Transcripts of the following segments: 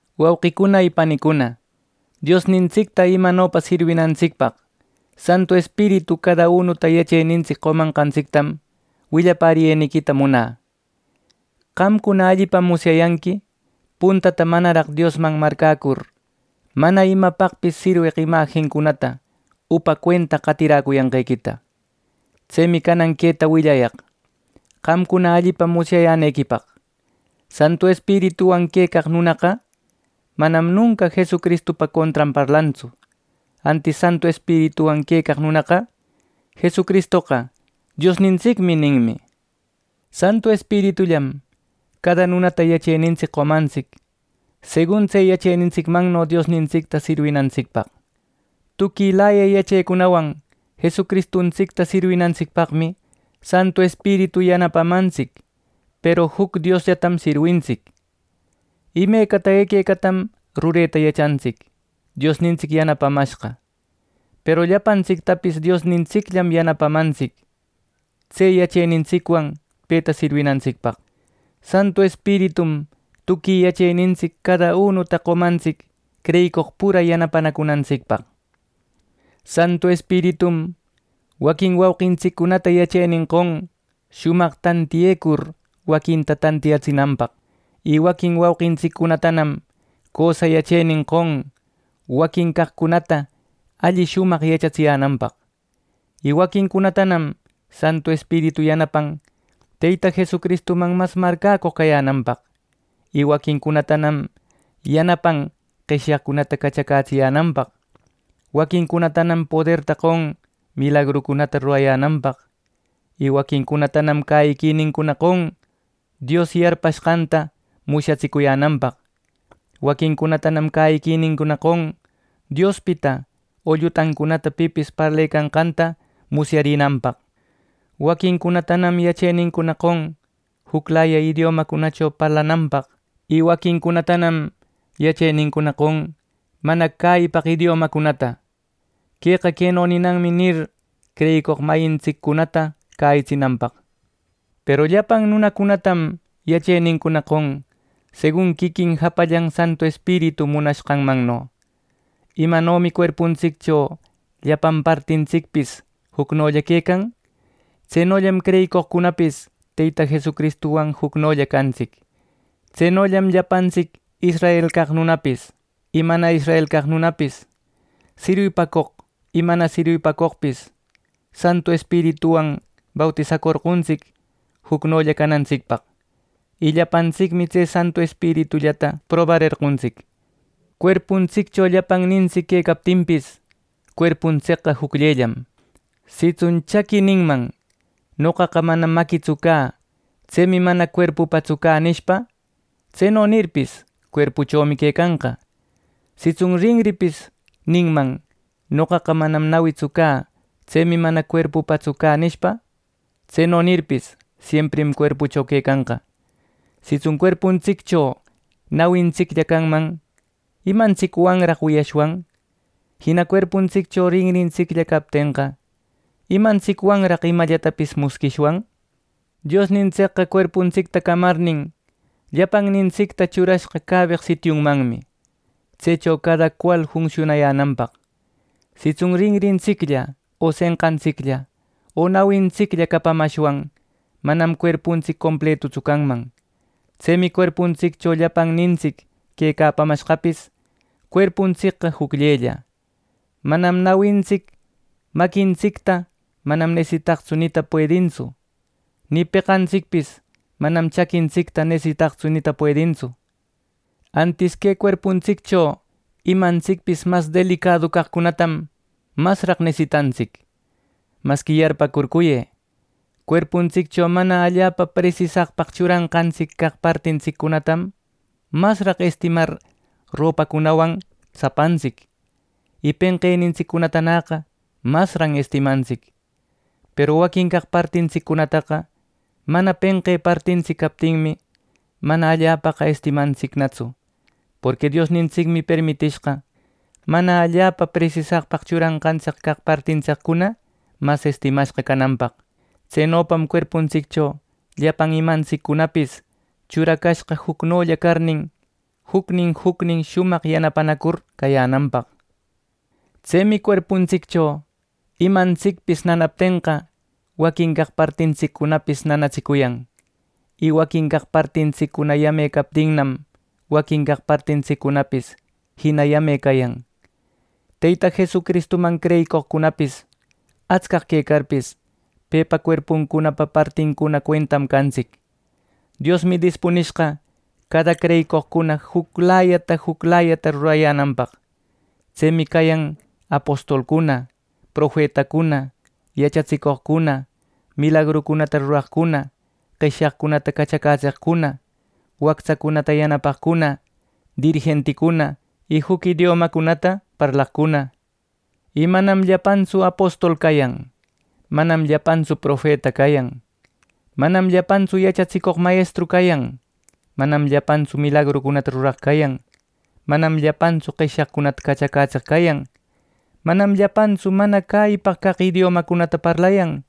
Wauquicuna y panicuna, Diosnintsicta imanopa sirwinantsicpaq Santu Espiritu cada unuta yachenintsic qomanqatsictam willapäriyeniquita munä. Qamcuna allipam musyayanqui puntata manaraq Diosman marcäcur, mana imapaqpis sirweq imajincunata upa cuenta qatiräcuyanqequita. Tsemi canan queta willayaq qamcuna allipa musyayänequipaq: Santu Espirituwan quecaq nunaqa, manam nunca Jesucristupa contran parlantsu. Antis Santu Espirituwan quecaq nunaqa “Jesucristoqa, ¡Diosnintsicmi!” ninmi. Santu Espiritullam cada nunata yachenintsic qomantsic, segun tse yachenintsicmanno Diosnintsicta sirwinantsicpaq. Tuquilaya yachecunawan Jesucristuntsicta sirwinantsicpaqmi Santu Espiritu yanapamantsic, peru juc Diosllatam sirwintsic. Imecata equecatam rureta yachantsic Diosnintsic yanapamashqa; peru llapantsictapis Diosnintsicllam yanapamantsic, tse yachenintsicwan peta sirwinantsicpaq. Santu Espiritum tuqui yachenintsic cada unuta qomantsic creyicoq pura yanapanacunantsicpaq. Santu Espiritum waquin wauqintsiccunata yachenin qon shumaq tantiyecur waquinta tantiyatsinanpaq, y waquin wauqintsiccunatanam cösa yachenin qon waquin caqcunatana alli shumaq yachatsiyänanpaq. Waquincunatanam Santu Espiritu yanapan Teyta Jesucristuman mas marcäcoq cayänanpaq, y waquincunatanam yanapan qeshyaqcunata cachacätsiyänanpaq. Waquincunatanam poderta qon milagrucunata rurayänanpaq, y waquincunatanam cäyiquinincuna qon Dios yarpanqanta musyatsicuyänanpaq. Waquincunatanam cäyiquinincuna qon Diospita o llutancunata pipis parlecanqanta musyarinanpaq. Waquincunatanam yachenincuna qon juclaya idiomacunacho parlananpaq, y waquincunatanam yachenincuna qon mana cäyipaq idiomacunata: “Queqa queno ninanmi” nir, creyicoq mayintsiccunata cäyitsinanpaq. Peru llapan nunacunatam yachenincuna qon segun quiquin japallan Santu Espiritu munanqanmanno. Imanomi cuerpuntsiccho llapan partintsicpis jucnolla quecan, tsenollam creyicoqcunapis Teyta Jesucristuwan jucnolla cantsic. Tsenollam llapantsic israel caq nunapis y mana israel caq nunapis, sirwipacoq y mana sirwipacoqpis, Santu Espirituwan bautisacorqontsic jucnolla canantsicpaq; y llapantsicmi tse Santu Espiritullata probarerqontsic. Cuerpuntsiccho llapannintsic quecaptinpis, cuerpuntsicqa jucllellam. Sitsun chaqui ninman “Noqaqa manam maquitsu cä. Tsemi mana cuerpupatsu cä” nishpa; tseno nirpis, cuerpuchomi quecanqa. Sitsun rinripis ninman “Noqaqa manam nawitsu cä. Tsemi mana cuerpupatsu cä” nishpa; tseno nirpis, siemprim cuerpucho quecanqa. Sitsun cuerpuntsiccho nawintsiclla canman, ¿imantsicwanraq wiyashwan? Jina cuerpuntsiccho rinrintsiclla captenqa, ¿imantsicwanraq imallatapis musquishwan? Diosnintsicqa cuerpuntsicta camarnin, llapannintsicta churashqa cäbeq sitiunmanmi, tsecho cada cual funsiunayänanpaq. Sitsun rinrintsiclla, o senqantsiclla, o nawintsiclla capamashwan, manam cuerpuntsic completutsu canman. Tsemi cuerpuntsiccho llapannintsic quecapamashqapis cuerpuntsicqa jucllella. Manam nawintsic maquintsicta “Manam nesitaqtsu” nita puedintsu. Nï peqantsicpis manam chaquintsicta “Nesitaqtsu” nita puedintsu. Antis que cuerpuntsiccho imantsicpis mas delicadu caqcunatam, masraq nesitantsic. Masqui yarpäcurcuyë: Cuerpuntsiccho mana allapa presisaqpaq churanqantsic caq partintsiccunatam, masqa estimar ropacunawan tsapantsic y penqenintsiccunatanäqa masran estimantsic. Peru waquin caq partintsiccunataqa mana penqe partintsic captinmi, mana allapaqa estimantsicnatsu, porqui Diosnintsicmi permitishqa mana allapa presisaqpaq churanqantsic caq partintsiccuna mas estimashqa cananpaq. Tsenopam cuerpuntsiccho llapan imantsiccunapis churacashqa jucnolla carnin, jucnin jucnin shumaq yanapanacur cayänanpaq. Tsemi cuerpuntsiccho imantsicpis nanaptenqa, waquin caq partintsiccunapis nanatsicuyan. Y waquin caq partintsiccuna yame captinnam, waquin caq partintsiccunanapis jina yame cayan. Teyta Jesucristuman creyicoqcunapis atscaq quecarpis, pepa cuerpunpa partincuna cuentam cantsic. Diosmi dispunishqa cada creyicoqcuna juclayata juclayata rurayänanpaq. Tsemi cayan apostolcuna, profetacuna, yachatsicoqcuna, milagrucunata ruraqcuna, qeshyaqcunata cachacätseqcuna, wactsacunata yanapaqcuna, dirijenticuna y juc idiomacunata parlaqcuna. Y manam llapantsu apostol cayan; manam llapantsu profeta cayan; manam llapantsu yachatsicoq mayestru cayan; manam llapantsu milagrucunata ruraq cayan. Manam llapantsu qeshyaqcunata cachacätseq cayan; manam llapantsu mana cäyipaq caq idiomacunata parlayan;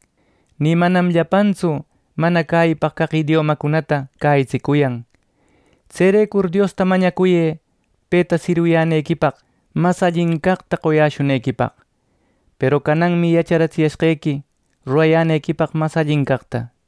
ni manam llapantsu mana cäyipaq caq idiomacunata cäyitsicuyan. Tserecur Diosta mañacuyë peta sirwiyänequipaq mas allin caqta qoyäshunequipaq. Peru cananmi yacharatsiyashqequi rurayänequipaq mas allin caqta.